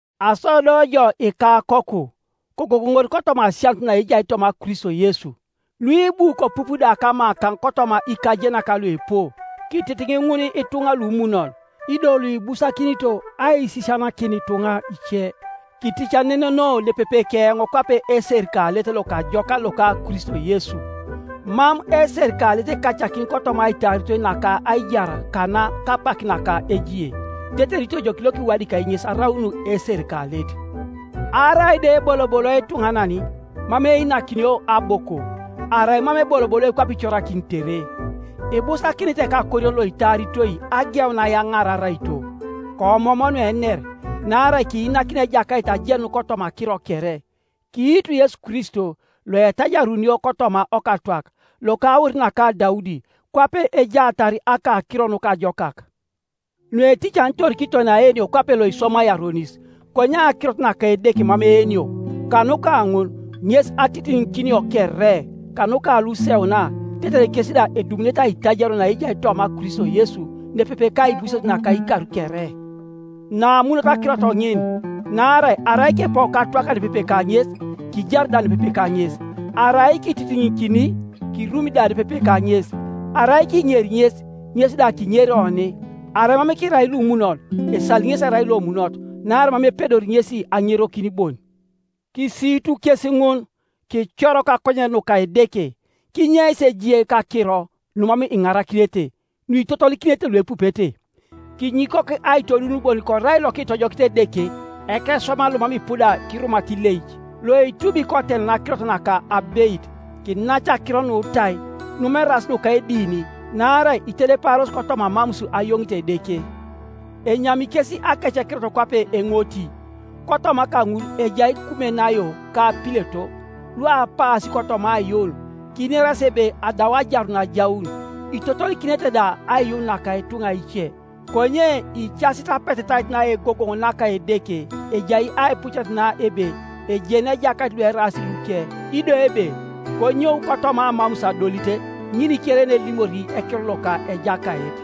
Aso do jo, ikakoku, kogogoŋor kotoma asianut naejai toma Kristo Yesu, Nuibu kopup da kamakaŋ kotoma ikajenak luipu, kititiŋ ŋun ituŋa lumunon, ido Iuibusakinito aisisianakin ituŋa ice. Kiticaneneno nepepe keoŋ kwape eserikalet lokajokan loka Kristo Yesu, Mam eserikalet ekacakin kotoma aitaaritoi naka aijar kana kapak naka ejie, tetere itojoki lokiwadikai ŋes araun eserikalet. Arai da eboloboloi ituŋanan, mam einakinio aboko, arai mam eboloboloi kwape icorakinitere. Ibusakinit ekakorion loitaaritoi ageun ayaŋaar araito. Koomoom nuener, naarai kiinakin Ejakait ajenun kotoma akiro kere. Kiitu Yesu Kristo, loetajarunio kotoma okatwak, loka aur naka Daudi, kwape ejaatar Akakiro Nukajokak, nueticanitor kiton aenio kwape loiswamai aronis. Konye akirot naka Edeke mam eenio. Kanuka ŋun ŋes atitiŋikinio kere, kanuka luseuna, tetere kes da edumunete aitajario naejai toma Kristo Yesu nepepe kaibuses naka ikar kere. Namunot akirot ŋin: naarai arai kipou katwaka nepepe kaŋes, kijari da nepepe kaŋes; arai kititiŋikini, kirumi da nepepe kaŋes; arai kiŋeri ŋes, ŋes da kiŋeri oni; arai mam kirai lumunon, esali ŋesi erai Iomunot, naarai mam epedori ŋesi aŋerokin bon. Kisiitu kes ŋun, kicor kakonyen nuka Edeke, kinyeis ejie kakiro, numam iŋarakinete, nuitotolikinete luepupete. Kinyikok aitoduun bon korai lokitojokit Edeke, ekeswaman lomam ipuda kirumata ileic, loitubi kotenan akirot naka abeit. Kinac akiro nutai, numam eraas nuka edini, naarai itedeparos kotoma amamus ayoŋit Edeke, enyami kes akecekirot kwape eŋoti. Kotoma kaŋul ejai Kumenaio ka Pileto, luapaasi kotoma aiyuun, kinerasi ebe adau ajarun ajaun, itotolikinete da aiyuun naka ituŋa ice. Konye icasit apetetait naegogoŋ naka Edeke, ejai aipucet na ebe, “Ejeni Ejakait lueraas luke,” ido ebe, “Konyou kotoma amamus adolit, ŋin kere yenelimori ekiror loka Ejakait.”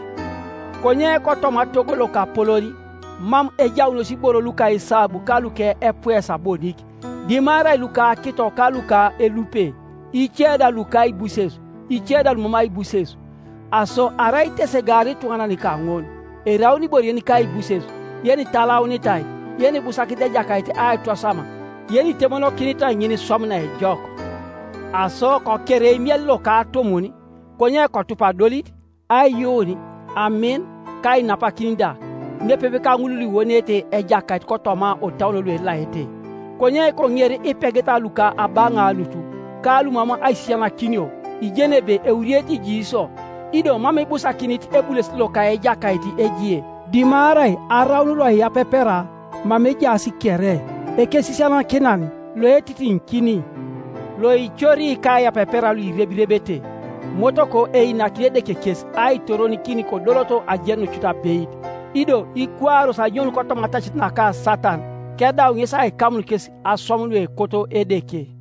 Konye kotoma togo lokapolon mam ejaunos iboro luka esabu ka luka epuesa bonik, dimarai luka akito ka luka elupe, ice da luka aibuses, ice da lumam aibuses. Aso arai itesegaar ituŋanan kaŋun, eraun ibore yenika aibuses, yenitalaunitai, yenibusakinit ejakait aitwasam, yenitemonokinitai ŋiniswam naejok. Aso koker eimiel loka atumun, konye kotup adolit, aiyuun, amin, ka ainapakin da, nepepe kaŋul luiwoneete Ejakait kotoma otauon luelaete. Konye koŋer ipegeta luka abaŋaanut, ka lumam aisisianakinio; ijeni ebe euriete ijiisio. Ido mam ibusakinit ebulesit loka Ejakait ejie, dimarai araun loiyapepera mama ejaas kere, ekesisianakinan, loetitiŋikin, loicori kaiyapepera luirebirebete. Motoko einakini Edeke kes aitoronikin kodoloto ajenun cut abeit, ido ikwaaros anyoun kotoma atacit naka Satan, kedau ŋesi aikamun kes aswam nuekoto Edeke.